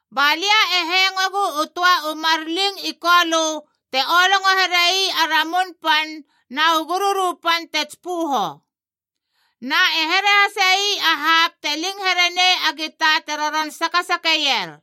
Ba lia e hengoegu u töa u mar ling i Kolö te olongo here ii a ramun pan na u gururu pan te tsipöho. Na e here hase ii a hapb te ling here nei a gita te roron sakasakeier.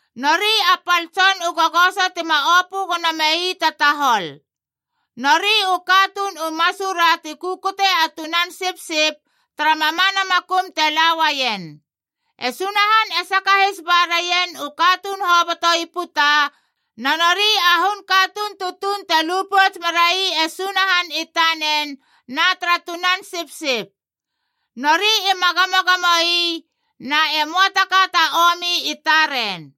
Nori a pal tson u gogoso tima opö gono mei ta tahol. Nori u katuun u masura ti kukute a Tunan Sipsip tara mamana makum te la uaien. E Sunahan e sakahis ba raien u katuun hoboto i puta, na nori a hun katuun tutuunc te lu pouts merai e Sunahan i tanen na tara Tunan Sipsip. Nori ima gamogamo ii, na e möa ta ka ta omi i taren.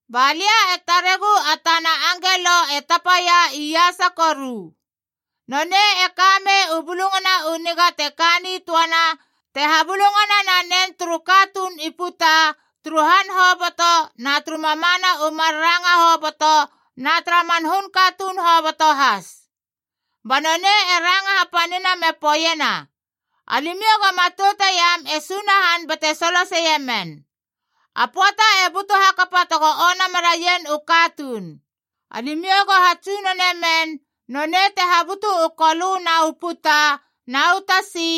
Ba lia e taregu a tana angelo e tapaia iasa koru. Nonei e ka mei u Bulungana u Niga te ka nitöana te habulungana nanen turu katuun i puta turu han hoboto na turu mamana u mar ranga hoboto na tara man hun katuun hoboto has. Ba nonei e ranga hapanina me poeiena, “Alimiou go matoute iam e Sunahan bate soloseie men. A pöata e butu hakapa tego ona meraien u katuun. Alimiou go hatsunone men, nonei te habutu u kolö na u puta na u tasi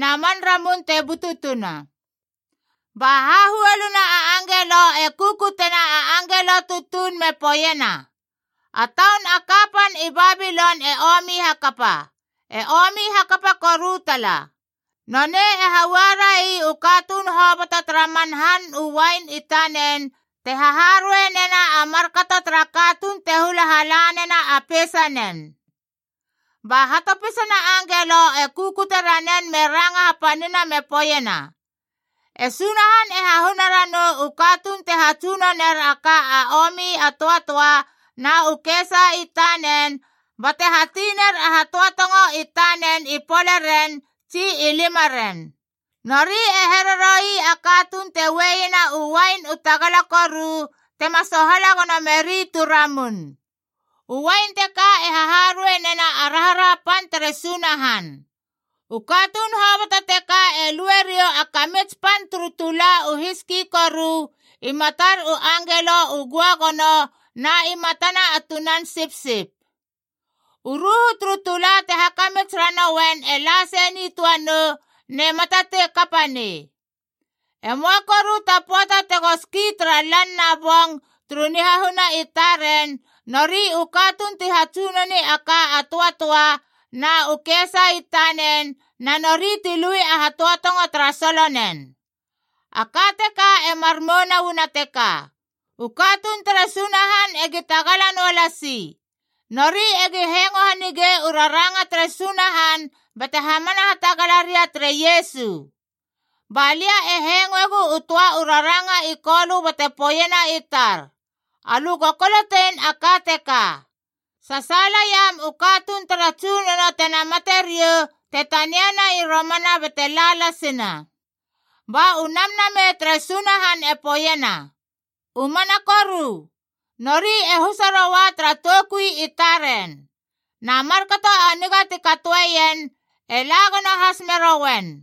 na man ramun te bututuna!” Ba hahuoluna a angelo e kukutena a angelo tutuun me poeiena, “A taun a kapan i Babilon e omi hakapa, e omi hakapa koru tala! Noneid e haua rai u katuun hoboto tara man han u uain i tanen te haharuei nena a markato tara katuun te hula hala nena a peisanen!” Ba hatopisana angelo e kukute ranen me ranga hapanina me poeiena, “E Sunahan e hahuna ranou u katuun te hatsunoner a ka a omi a töatöa na u kesa i tanen, bate hati ner a hatöatongo i tanen i poleren tsi i limaren. Nori e here roi a katuun te ueiena u uain u tagala koru tema sohala gono meri tu ramun. U uain teka e haharuei nena a raharaha pan tere Sunahan. U katuun hoboto teka e lue riou a kamits pan turu tula u hiski koru, i matar u angelo u göagono na i matana a Tunan Sipsip. U ruhu turu tula te hakamits ranouen e la sei nitöa nou, nema tatei kapa nei. E möa koru ta pöata tego ski tara lan na bong turu nihahuna i taren, nori u katuun ti hatsunoni a ka a töatöa na u kesa i tanen na nori ti lui a hatöatongo tara solonen.” A ka teka e mar mouna uana teka: u katuun tere Sunahan egi tagala noa lasi. Nori egi hengo hanigei u raranga tere Sunahan bate hamana hatagala ria tere Iesu. Ba lia e hengoegu u töa u raranga i Kolö bate poeiena i tar, “Alö go kolotein a ka teka: Sasaala iam u katuun tara Tsunono tena mate riou te taniana i romana bate la lasina!” Ba u Namnamei tere Sunahan e poeiena, “U mana koru! Nori e husa roua tara toukui i taren. Na markato a niga ti katoeien e la gono has merouen.”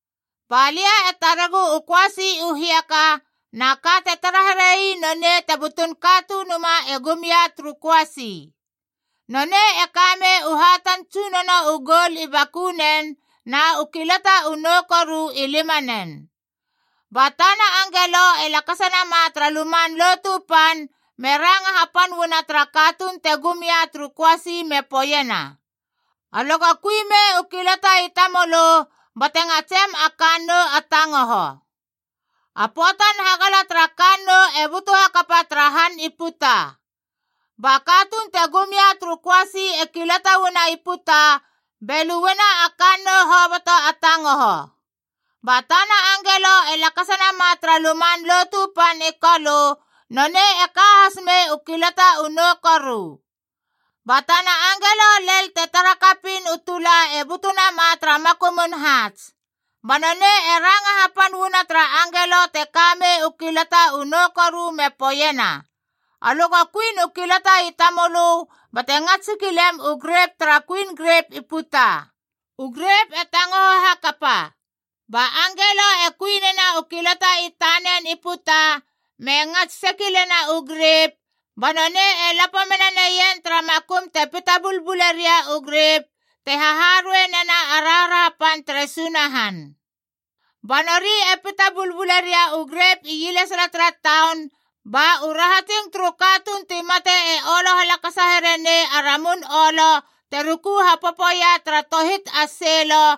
Ba lia e taregu u köasi u hiaka, na ka te tara here ii nonei te butun Katunumae e gum ia turu köasi. Nonei e ka mei u hatan tsunono u goul i bakunen na u kilataf u nou koru i limanen. Ba tana angelo e lakasa nama tara Luman Lotu Pan be ranga hapan uana tara katuun te gum ia turu köasi me poeiena, “Alö go kui me u kilata i tamölö bate ngatsem a kannou a tangoho. A pöatan hagala tara kannou e butu hakapa tara han i puta!” Ba katuun te gum ia turu köasi e kilata uana i puta be luena a kannou hoboto a tangoho.g Ba tana angelo e lakasa nama tara Luman Lotu Pan i Kolö, nonei e ka has mei u kilatah u nou koru. Ba tana angelo lel te tara kapiin u tula e butu nama tara makumun haats.i Ba nonei e ranga hapan uana tara angelo te ka mei u kilata u nou koru me poeiena, “Alö go kuin u kilata i tamölö bate ngats sekilem u grep tara kuin grep i puta. U grep e tangoho hakapa!” Ba angelo e kui nena u kilata i tanen i puta me ngats sekilena u grep,j ba nonei e lapo mena neien tara makum te pita bulbule ria u grep, te haharuei nena a raharaha pan tere Sunahan. Ba nori e pita bulbule ria u grep ielesala tara taun, ba u rahatsing turu katuun ti mate e olo halakasa here nei a ramun olo te ruku hapopoia tara tohit a seilo,